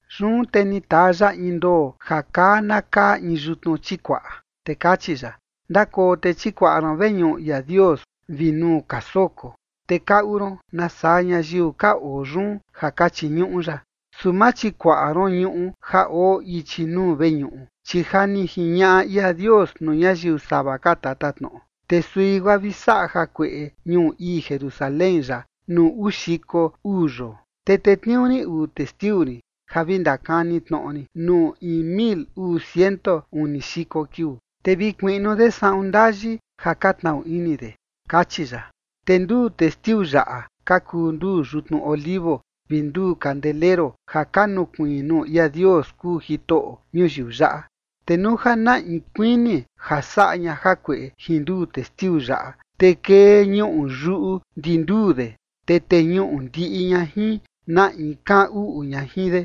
Yun te ni taa ya in ndoo ja kaa na kaa in yutnu chikuaꞌa, te kachi ya: ―Ndakoo te chikuaꞌa ron veñuꞌu ia Dios vi nuu ka soko, te kaꞌu ron nasaa ñayiu ka oo yun ja ka chiñuꞌu ya. Su ma chikuaꞌa ron ñuꞌu ja oo ichi nuu veñuꞌu, chi ja ni jiñaꞌa ia Dios nuu ñayiu sava ka tatatnoꞌo, te sui guaa vi saꞌa jakueꞌe ñuu ii Jerusalén yaꞌa nuu uu xiko uu yoo. Te tetniuu rin uu testiu rin ja vi ndakani tnoꞌo rin nuu in mil uu ciento uni xiko kiuu. Te vi kuiꞌnu de saꞌun ndayi ja ka tnaꞌu ini de ―kachi ya. Te nduu testiu yaꞌa ka kuu nduu yutnu olivo vi nduu kandeleru ja ka nukuiin nuu ia Dios kuu Jitoꞌo ñuyiu yaꞌa. Te nuu ja na in kuini ja saꞌa ña jakueꞌe jin nduu testiu yaꞌa, te kee ñuꞌu yuꞌu ndi nduu de, te teñuꞌu ndiꞌi ña jin na in kaꞌan uꞌu ña jin de.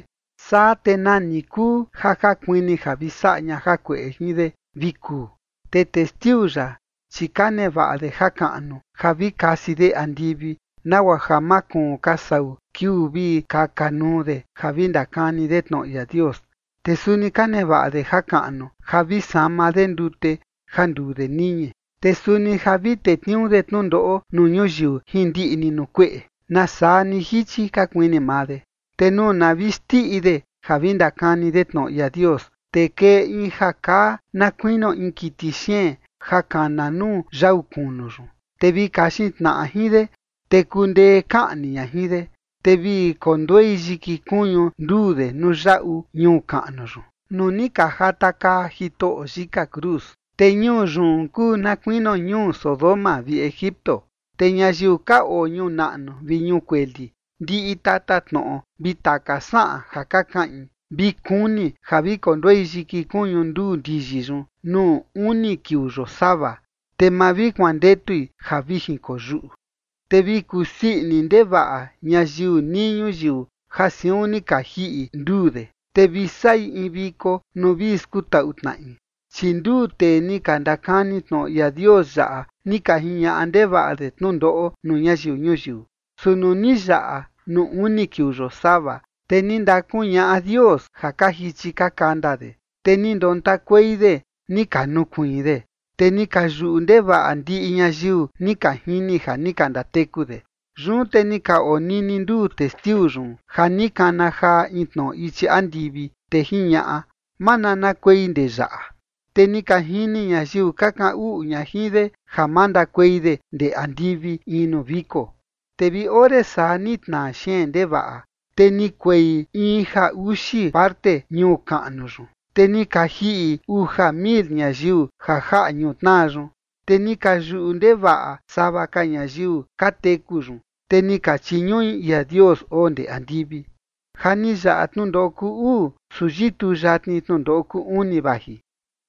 Saa te nani kuu ja ka kuini ja vi saꞌa ña jakueꞌe jin de vi kuu. Te testiu yaꞌa, chi ka nevaꞌa de jakaꞌnu ja vi kasi de andivi nagua ja ma kuun ka sau kiuu vi kaka nuu de ja vi ndakani de tnoꞌo ia Dios. Te suni ka nevaꞌa de jakaꞌnu ja vi sama de ndute ja nduu de niñi. Te suni ja vi tetniuu de tnundoꞌo nuu ñuyiu jin ndiꞌi ni nuu kueꞌe, nasaa ni jichi ka kuini maa de. Te nuu na vi xndiꞌi de ja vi ndakani de tnoꞌo ia Dios, te kee in ja kaa na kuinio in kiti xeen ja kana nuu yau kunu yun. Te vi kaxin tnaꞌa jin de, te kundee kaꞌni ña jin de. Te vi konduei yiki kuñu nduu de nuu yaꞌu ñuu kaꞌnu yun, nuu ni ka jatakaa Jitoꞌo yika cruz. Te ñuu yun kuu na kuinio ñuu Sodoma vi Egipto. Te ñayiu ka oo ñuu naꞌnu vi ñuu kueli, ndiꞌi tatatnoꞌo vi taka saꞌan ja ka kaꞌin, vi kuni ja vi konduei yiki kuñu nduu ndiyi yun nuu uni kiuu yosava, te ma vi kuandetui ja vi jinkoyuꞌu. Te vi kusii ini ndevaꞌa ñayiu nii ñuyiu ja siun ni ka jiꞌi nduu de, te vi saꞌi in viko nuu vi skutaꞌu tnaꞌi, chi nduu tee ni ka ndakani tnoꞌo ia Dios yaꞌa ni ka jiñaꞌa ndevaꞌa de tnundoꞌo nuu ñayiu ñuyiu. Su nuu ni yaꞌa nuu uni kiuu yosava, te ni ndakuñaꞌa Dios ja ka jichi ka kanda de. Te ni ndontakuei de, ni ka nukuiin de. Te ni ka yuꞌu ndevaꞌa ndiꞌi ñayiu ni ka jini ja ni ka ndateku de. Yun te ni ka onini nduu testiu yun ja ni kana jaa in tnoꞌo ichi andivi, te jiñaꞌa: ―Mananakuei ndee yaꞌa. Te ni ka jini ñayiu ka kaꞌan uꞌu ña jin de ja mandakuei de ndee andivi in nuu viko. Te vi ore saa ni tnaa xeen ndevaꞌa, te ni kuei in ja uxi parte ñuu kaꞌnu yun, te ni ka jiꞌi uja mil ñayiu ja jaꞌa ñutnaa yun. Te ni ka yuꞌu ndevaꞌa sava ka ñayiu ka teku yun, te ni ka chiñuꞌi ia Dios oo ndee andivi. Ja ni yaꞌa tnundoꞌo kuu uu, su yituu yatni tnundoꞌo kuu uni vaji.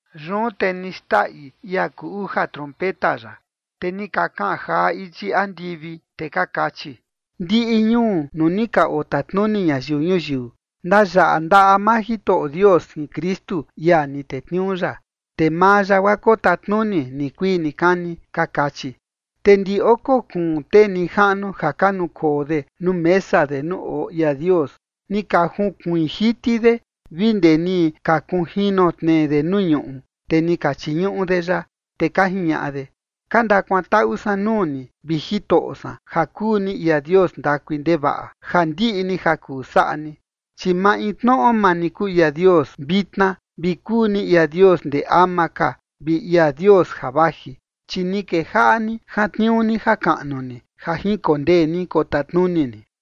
Yun te ni xndaꞌi ia kuu uja trompeta ya. Te ni ka kaꞌan jaa ichi andivi, te ka kachi: Ndiꞌi ñuu nuu ni ka otatnuni ñayiu ñuyiu, ndayaꞌa ndaꞌa maa Jitoꞌo Dios jin Kristu, ia ni tetniuu ya. Te maa ya guaa kotatnuni nikuii nikani. Ka kachi. Te ndi oko kuun tee nijaꞌnu ja ka nukoo de nuu mesa de nuu oo ia Dios, ni ka junkuiin jiti de vi ndee ni ka kunjino tnee de nuu ñuꞌu, te ni ka chiñuꞌu de ya, te ka jiñaꞌa de: Ka ndakuantaꞌu san nuu ni, vi Jitoꞌo san ja kuu ni ia Dios ndakui ndevaꞌa, ja ndiꞌi ni ja kuu ja saꞌa ni. Chi maintnoꞌo maa ni kuu ia Dios vitna vi kuu ni ia Dios ndee ama ka vi ia Dios ja vaji. Chi ni kejaꞌa ni jantniuu ni jakaꞌnu ni, ja jinkondee ni kotatnuni ni.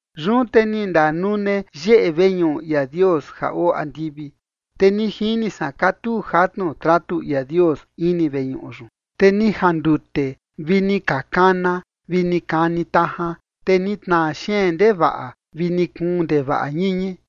Yun te ni ndanune yeꞌe veñuꞌu ia Dios ja oo andivi, te ni jini san katuu jatnu tratu ia Dios ini veñuꞌu yun. Te ni jandute vi ni ka kana vi ni kani tajan, te ni tnaa xeen ndevaꞌa vi ni kuun ndevaꞌa ñiñi.